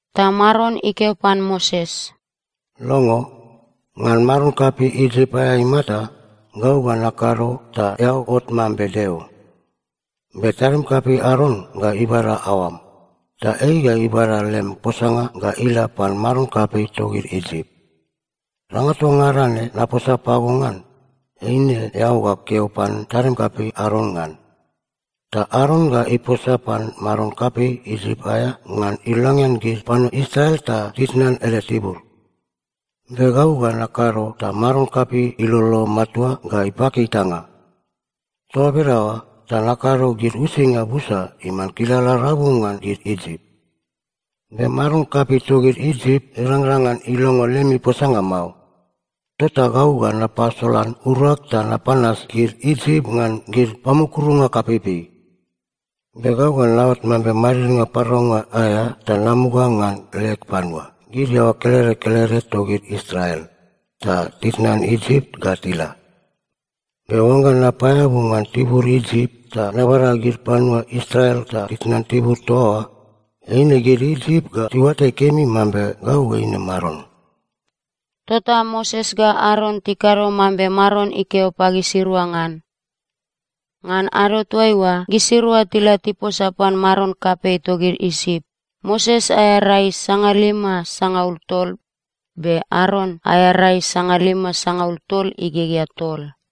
Ta Maron ikeo pan Moses, “Longo. Ngan maron kapei Isip aea imata, gau ga nakado ta eao ot mambe Deo. Be tadim kapei Aron ga ibada aoam, ta ei ga ibada lem posanga ga ila pan maron kapei togid Isip. Danga toa ngada ne naposa pago ngan, eine eao ga keo pan tadim kapei Aron ngan. Ta Aron ga iposa pan maron kapei Isip aea ngan ilongean gid panua Israel ta titnan ele tibur. Be gau ga nakado ta maron kapei ilolo matua ga ipaki itanga. Toa bedaoa ta nakado gid uisinga busa iman kilala rabu ngan gid Isip. Be maron kapei togid Isip irangrang ngan ilongo lemi posanga mao. Tota gau ga napasolan urag ta napanas gid Isip ngan gid pamukurunga kapeipei. Be gau ga naot mambe madidnga paraunga aea ta namuga ngan leg panua, gid iaoa kelede kelede togid Israel, ta titnan Isip ga tila. Be oangga napaeabu ngan tibur Isip ta nabada gid panua Israel ta titnan tibur toa oa, eine gid Isip ga tiuatai kemi mambe gau eine Maron.” Tota Moses ga Aron tikado mambe Maron ikeo pagisirua ngan. Ngan ado toaiua gisirua tila tiposa pan maron kapei togid Isip, Moses aea rai sangalima sangaul tol, be Aron aea rai sangalima sangaul tol igegea tol.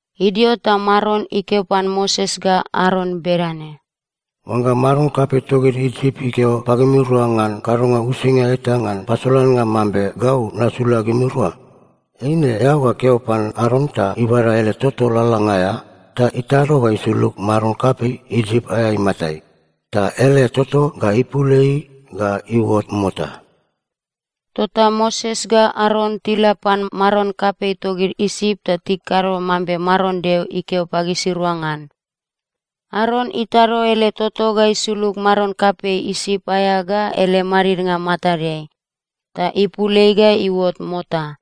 Idio ta Maron ikeo pan Moses ga Aron bedane, “Oangga maron kapei togid Isip ikeo pagimirua ngan kadonga uisinga eta ngan pasolannga mambe gau nasula gimirua, eine eao ga keo pan Aron ta ibada ele toto lalalanga aea ta itado ga isulug maron kapei Isip aea imatai, ta ele toto ga ipul ei ga iuot mota.” Tota Moses ga Aron tila pan maron kapei togid Isip ta tikado mambe Maron Deo ikeo pagisirua ngan. Aron itado ele toto ga isulug maron kapei Isip aea ga ele madidnga matadeai, ta ipul ei ga iuot mota.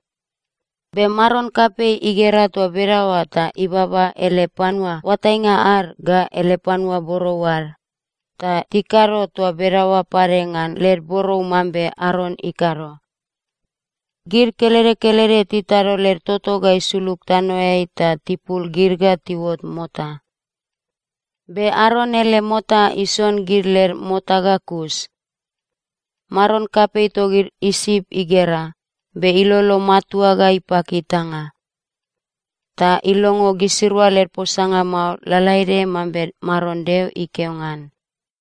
Be maron kapei igera toa bedaoa ta ibaba ele panua oatainga ad ga ele panua borou ad, ta tikado toa bedaoa pade ngan led borou mambe Aron ikado. Gid kelede kelede titado led toto ga isulug tanoeai ta tipul gid ga tiuot mota. Be Aron ele mota ison gid led mota ga kus. Maron kapei togid Isip igera, be ilolo matua ga ipaki itanga. Ta ilongo gisirua led posanga mao, lalaede mambe Maron Deo ikeo ngan.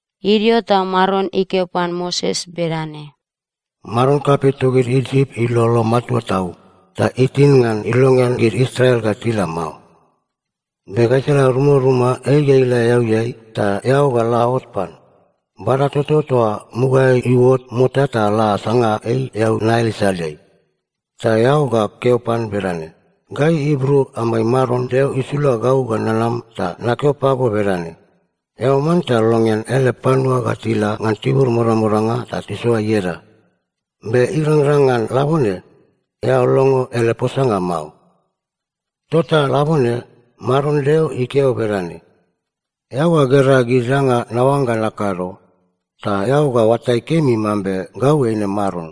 Idio ta Maron ikeo pan Moses bedane, “Maron kapei togid Isip ilolo matua tau, ta itin ngan ilongean gid Israel ga tila mao. Be gaisala rumaruma ei ga ila eauiai, ta eao ga la ot pan. Bada toto toa mugaeai iuot mota ta la sanga ei eau Nail isaleai. Ta eao ga keo pan bedane, ‘Gai Ibru amai Maron Deo isula gau ga nanam ta nakeo pago bedane: Eao manta longean ele panua ga tila ngan tibur modamodanga ta tisoa ieda. Be irangrang ngan labone, eao longo ele posanga mao. Tota labone Maron Deo ikeo bedane: Eao ga gera gid danga naoangga nakado, ta eao ga oatai kemi mambe gau eine Maron.’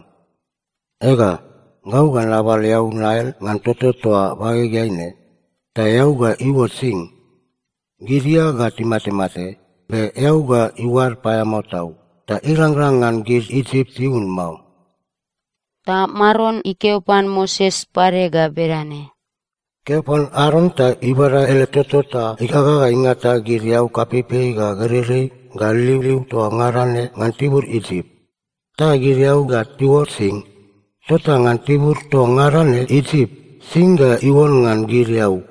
Ega, gau ga nabal eau Nail ngan toto toa bagegeai ne, ta eau ga iuot sing. Gid ia ga timatemate, be eau ga iuad paeamao tau, ta irangrang ngan gid Isip tiun mao.” Ta Maron ikeo pan Moses pade ga bedane, “Keo pan Aron ta ibada ele toto ta igaga ga ingata gid eau kapeipei ga gereirei ga liuliu toa ngada ne ngan tibur Isip. Ta gid eau ga tiuot sing. Tota ngan tibur toa ngada ne Isip, sing ga iuon ngan gid eau.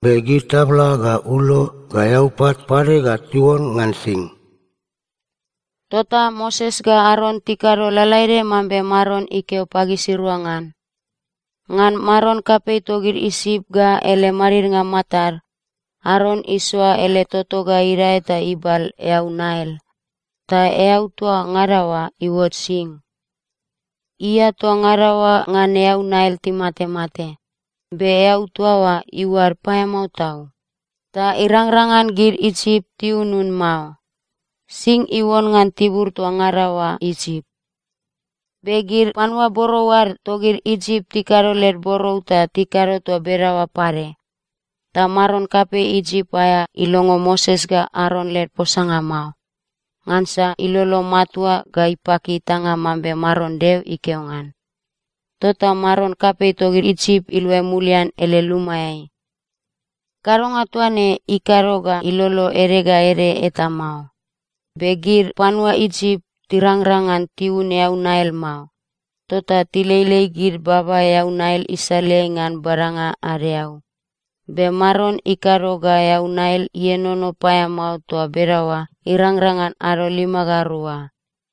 Be gid tabla ga ulo ga eaupat pade ga tiuon ngan sing.” Tota Moses ga Aron tikado lalaede mambe Maron ikeo pagisirua ngan. Ngan maron kapei togid Isip ga ele madidnga matad, Aron isoa ele toto ga idae ta ibal eau Nail, ta eau toa ngada oa iuot sing. Ia toa ngada oa ngan eau Nail timatemate, be eau toa oa iuad paeamao tau, ta irangrang ngan gid Isip tiunun mao. Sing iuon ngan tibur toa ngada oa Isip. Be gid panua borou ad togid Isip tikado led borou ta tikado toa bedaoa pade. Ta maron kapei Isip aea ilongo Moses ga Aron led posanga mao, ngansa ilolo matua ga ipaki itanga mambe Maron Deo ikeo ngan. Tota maron kapei togid Isip iluai mulian ele lumaeai. Kadonga toa ne ikado ga ilolo ede ga ede eta mao. Be gid panua Isip tirangrang ngan tiun eau Nail mao, tota tileilei gid baba eau Nail isaleai ngan badanga ad eau. Be Maron ikado ga eau Nail ienono paeamao toa bedaoa irangrang ngan ado lima ga rua.